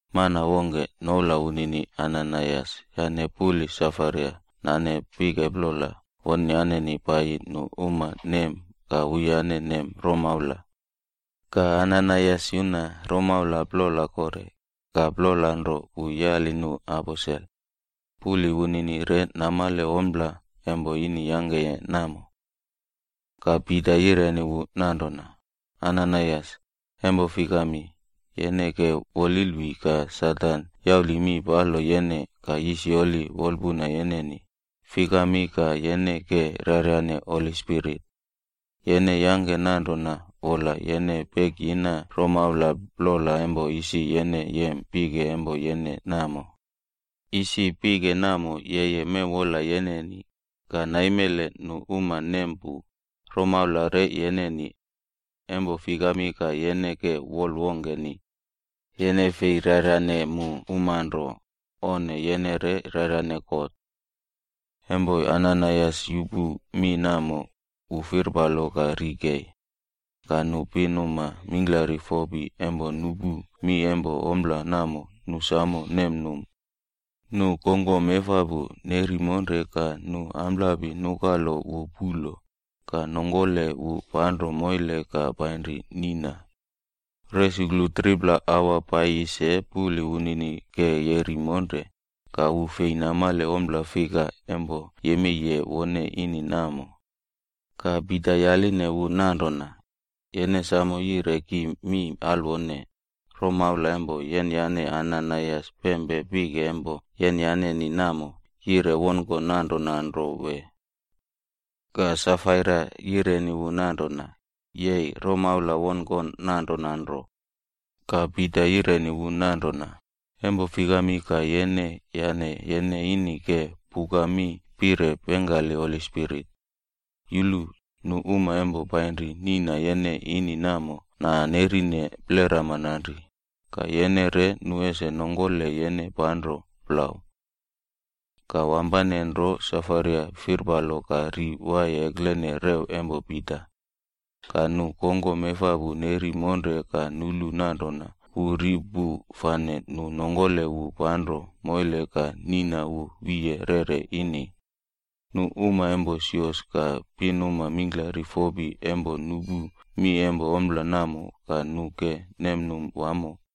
Mana wongke noula wunini Ananaias yane puli Safaira nane pike plola wonyaneni paiyi nu uma nem ka wuyane nem romaula. Ka Ananaias yuna romaula plola kore, ka plola nro wu yali nu aposel. Puli wunini re namale ompla empo ini yangkeye namo. Ka Pita yireni wu nanrona, “Ananaias, empo fikami, yene ke wolilwi ka Satan yauli mi palo yene ka yisyoli wolpuna yeneni, fikami ka yene ke raryane Holi Spirit? Yene yangke nanrona wola yene pekiyina romaula plola empo isi yene yem pike empo yene namo. Isi pike namo yeye mewwola yeneni, ka naimele nu uma nem pu, romaula re yeneni. Empo fikami ka yene ke wol wongkeni? Yene fei raryane mu uma nro onne, yene re raryane God.” Empo Ananaias yupu mi namo, wu firpalo ka ri kei. Ka nu pinuma mingklari fopi empo nupu mi empo ompla namo nu samo nemnum. Nu kongkom efapu neri monre ka nu amplapi nukalo wu pulo, ka nongkole wu panro moile ka painri niꞌna. Resuklu 3pla aua paiyi se puli wunini ke yeri monre, ka wu fei namale ompla fika empo yemeiye wone ini namo. Ka Pita yaline wu nanrona, “Yene samo yire ki mi alwone, romaula empo yenyane Ananaias pempe pike empo yenyaneni namo yire wonkon nanrona nro wee?” Ka Safaira yireni wu nanrona, “Yei, romaula wonkon nanrona nro.” Ka Pita yireni wu nanrona, “Empo fikami ka yene yane yene ini ke puka mi pire pengkali Holi Spirit? Yulu, nu uma empo painri niꞌna yene ini namo nanerine plerama nanri, ka yene re nu ese nongkole yene panro plau.” Ka wampanenro Safaira firpalo ka ri waiye eklene rew empo Pita. Ka nu kongkom efapu neri monre ka nulu nanrona wu ri pu fane nu nongkole wu panro moile ka niꞌna wu wiye rere ini. Nu uma empo sios ka pinuma mingklari fopi empo nupu mi empo ompla namo ka nu ke nemnum wamo.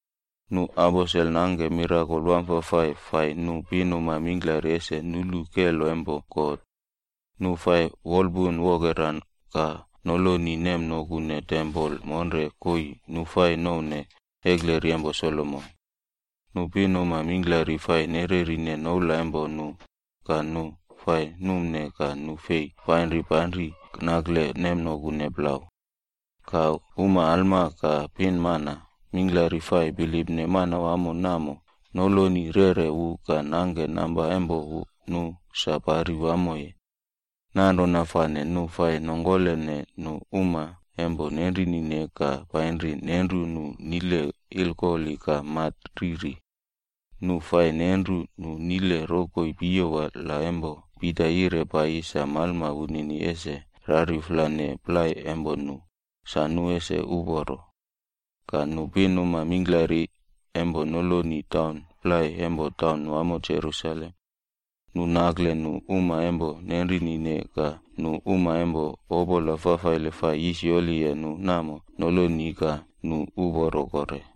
Nu aposel nangke mirakol wamfafai fai nu pinuma mingklari ese nulu kelo empo God. Nu fai wolpunwokera ka noloni nemnokune tempol monre koii nu fai nouwne ekleri empo Solomon. Nu pinuma mingklari fai nererine noula empo nu, ka nu fai numne ka nu fei fai painri nakle nemnokune plau. Ka uma alma ka pinmana mingklari fai bilipne Manawamo namo noloni rere wu ka nangke namba empo nu sa pari wamoye. Nanrona fane nu fai nongkolene nu uma empo nenrinine ka painri nenru nu nile ilkoli ka mat riri. Nu fai nenru nu nile rokoi piyowa la empo Pita yire paiyi sa malma wunini ese raryuflane plai empo nu, sa nu ese uporo. Ka nu pinuma mingklari empo noloni taun plai empo taunwamo Jerusalem. Nu nakle nu uma empo nenrinine ka nu uma empo opola fafaile fai yisyoliye nu namo noloni ka nu uporo kore.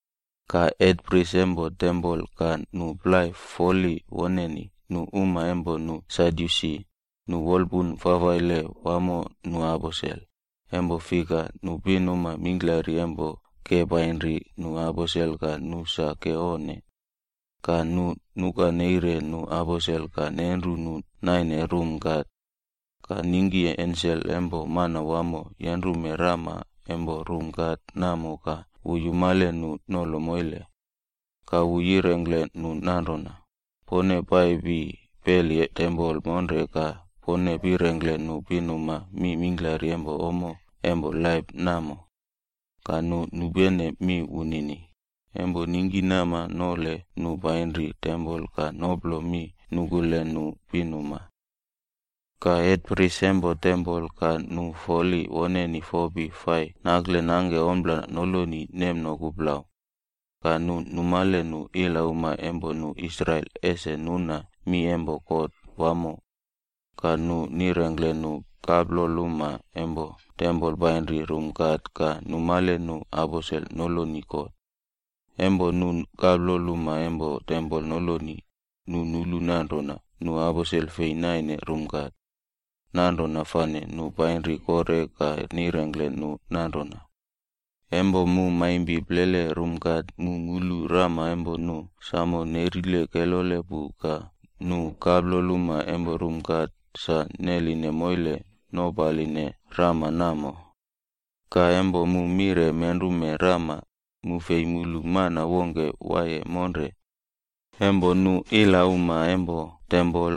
Ka hetpris empo tempol ka nu plai foli woneni, nu uma empo nu Sadyusi, nu wolpuna fafaile wamo nu aposel, empo fika nu pinuma mingklari empo ke painri nu aposel ka nu sa ke onne. Ka nu nukaneire nu aposel ka nenru nu naine rum kat. Ka ningki ensel empo Manawamo yenrume rama empo rum kat namo ka wu yumale nu nolo moile. Ka wu yirengkle nu nanrona, “Pone paipi peli tempol monre ka pone pirengkle nu pinuma mi mingklari empo ommo empo laip namo.” Ka nu nupene mi wunini, empo ningkinama nole nu painri tempol ka noplo mi nukule nu pinuma. Ka hetpris empo tempol ka nu foli woneni fopi fai nakle nangke ompla noloni nemnoku plau. Ka nu numale nu ilauma empo nu Israel ese nuna mi empo kot wamo. Ka nu nirengkle nu kaploluma empo tempol painri rum kat ka numale nu aposel noloni kot. Empo nu kaploluma empo tempol noloni, nu nulu nanrona nu aposel fei naine rum kat. Nanrona fane nu painri kore ka nirengkle nu nanrona, “Empo mu maimpi plele rum kat mu mulu rama empo nu samo nerile kelole pu ka nu kaploluma empo rum kat sa neline moile nopaline rama namo. Ka empo mu mire menrume rama, mu fei mulu mana wongke waiye monre.” Empo nu ilauma empo tempol,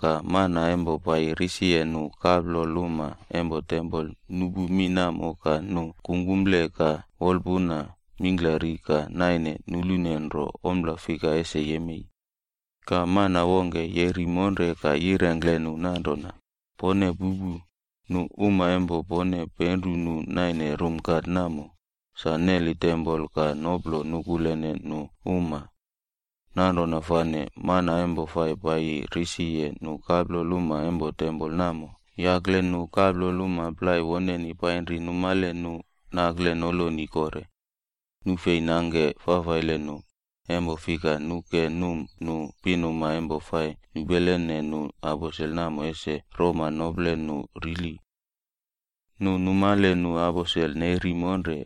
ka mana empo paiye risiye nu kaploluma empo tempol nupu mi namo ka nu kungkumple ka wolpuna mingklari ka naine nulune nro ompla fika ese yemei. Ka mana wongke yeri monre ka yirengkle nu nanrona, “Pone pupu, nu uma empo pone penru nu naine rum kat namo, sa neli tempol ka noplo nukulene nu uma.” Nanrona fane mana empo fai paiyi risiye nu kaploluma empo tempol namo yakle nu kaploluma plai woneni painri numale nu nakle noloni kore. Nu fei nangke fafaile nu, empo fika nu ke num nu pinuma empo fai nupelene nu aposel namo ese roma nople nu rili. Nu numale nu aposel neri monre,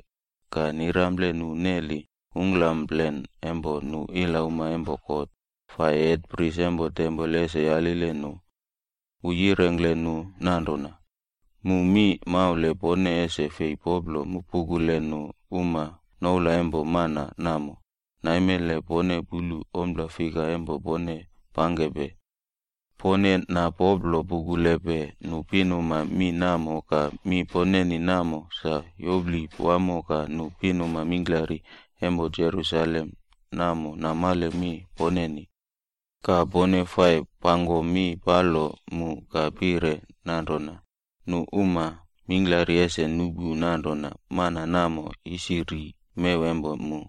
ka nirample nu neli ungklamplen empo nu ilauma empo kot, fai hetpris empo tempol ese yalile nu. Wu yirengkle nu nanrona, “Mu mi maule pone ese fei poplo pukule nu uma noula empo mana namo, naimele pone pulu ompla fika empo pone pangkepe! Pone napoplo pukulepe nu pinuma mi namo ka mi poneni namo sa yopli wamo ka nu pinuma mingklari empo Jerusalem namo namale mi poneni. Ka pone fai pangko mi palo mu ka pire nanrona, nu uma mingklari ese nupu nanrona mana namo isi ri mew empo mu.”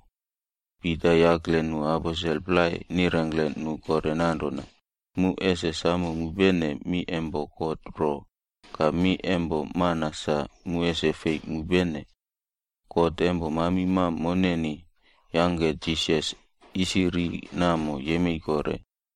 Pita yakle nu aposel plai nirengkle nu kore nanrona, “Mu ese samo mupene mi empo God ro, ka mi empo mana sa mu ese fei mupene! God empo mamimam moneni yangke Jisas isi ri namo yemei kore.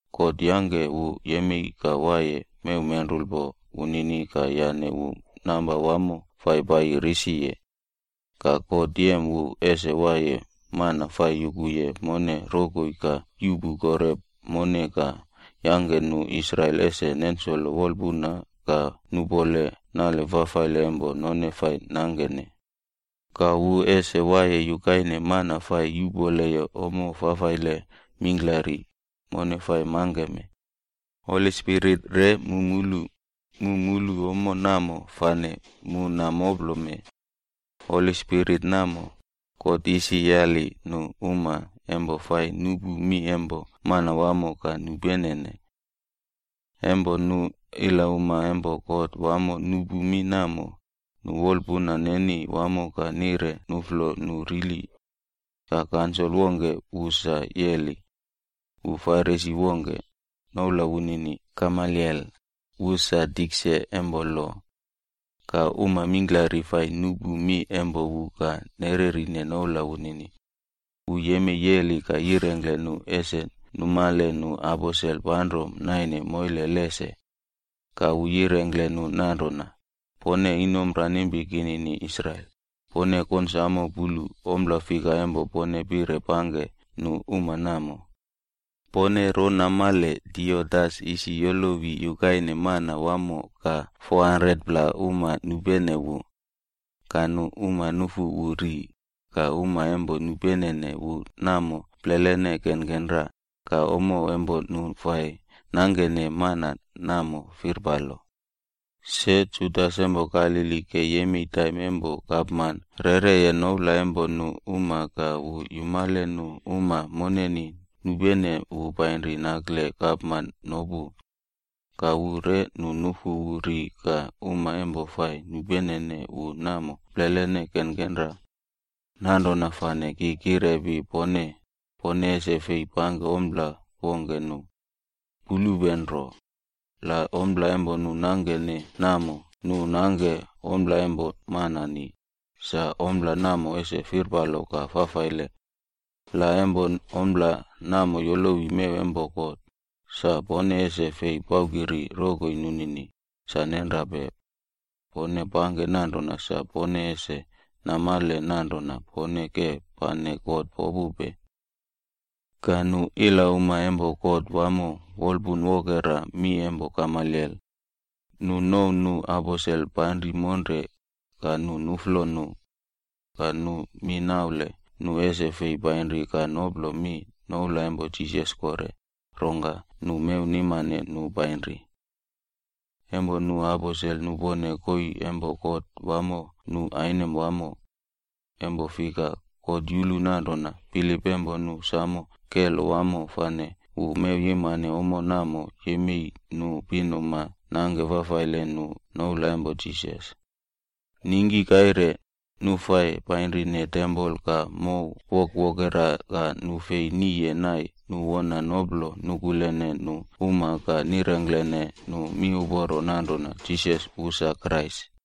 God yangke wu yemei ka waiye mewmenrulpo wunini ka yane wu namba wamo fai paiyi risiye. Ka God yem wu ese waiye mana fai yukuye mone rokoi ka yuꞌpu kore mone ka yangke nu Israel ese nensolo wolpuna ka nupole nale fafaile empo none fai nangkene. Ka wu ese waiye yukaine mana fai yuꞌpoleye ommo fafaile mingklari, mone fai mangkeme. Holi Spirit re mu mulu, mu mulu ommo namo fane mu namoplome. Holi Spirit namo, God isi yali nu uma empo fai nupu mi empo Manawamo ka nupenene.” Empo nu ilauma empo kot wamo nupu mi namo, nu wolpuna neni wamo ka nire nuflo nu rili. Ka kansol wongke wu sa yeli. Wu Farisi wongke, noula wunini Gamaliel, wu sa tikse empo lo. Ka uma mingklari fai nupu mi empo wu ka nererine noula wunini. Wu yemei yeli ka yirengkle nu ese numale nu aposel panro naine moile lese. Ka wu yirengkle nu nanrona, “Pone inomranimpi kinini Israel, pone konsamo pulu ompla fika empo pone pire pangke nu uma namo. Pone ro namale Teudas isi yolowi yukaine mana wamo ka 400pla uma nupene wu. Ka nu uma nufu wu ri, ka uma empo nupenene wu namo plelene kenkenra, ka ommo empo nu fai nangkene mana namo firpalo. Se Judas empo Galili ke yemei taim empo gapman reꞌreye noula empo nu uma ka wu yumale nu uma moneni nupene wu painri nakle gapman nopu. Ka wu re nu nufu wu ri ka uma empo fai nupenene wu namo plelene kenkenra. Nanrona fane ki kirepi pone, pone ese fei pangke ompla wongke nu. Pulupe nro. La ompla empo nu nangkene namo, nu nangke ompla empo manani, sa ompla namo ese firpalo ka fafaile. La empo ompla namo yolowi mew empo God, sa pone ese fei paukiri rokoi nunini, sa nenrape! Pone pangke nanrona sa pone ese namale nanrona pone ke pane God popupe.” Ka nu ilauma empo kot wamo wolpunwokera mi empo Gamaliel. Nu nouw nu aposel panri monre, ka nu nuflo nu. Ka nu mi naule nu ese fei painri ka noplo mi noula empo Jisas kore, rongka nu mewnimane nu painri. Empo nu aposel nupone koii empo kot wamo nu ainem wamo. Empo fika God yulu nanrona bilip empo nu samo kelo wamo fane wu mewyimane ommo namo nemei nu pinuma nangke fafaile nu noula empo Jisas. Ningki kaire, nu fai painrine tempol ka mow wokwokera ka nu fei niye nai nu wona noplo nukulene nu uma ka nirengklene nu miuporo nanrona Jisas wu sa Krais.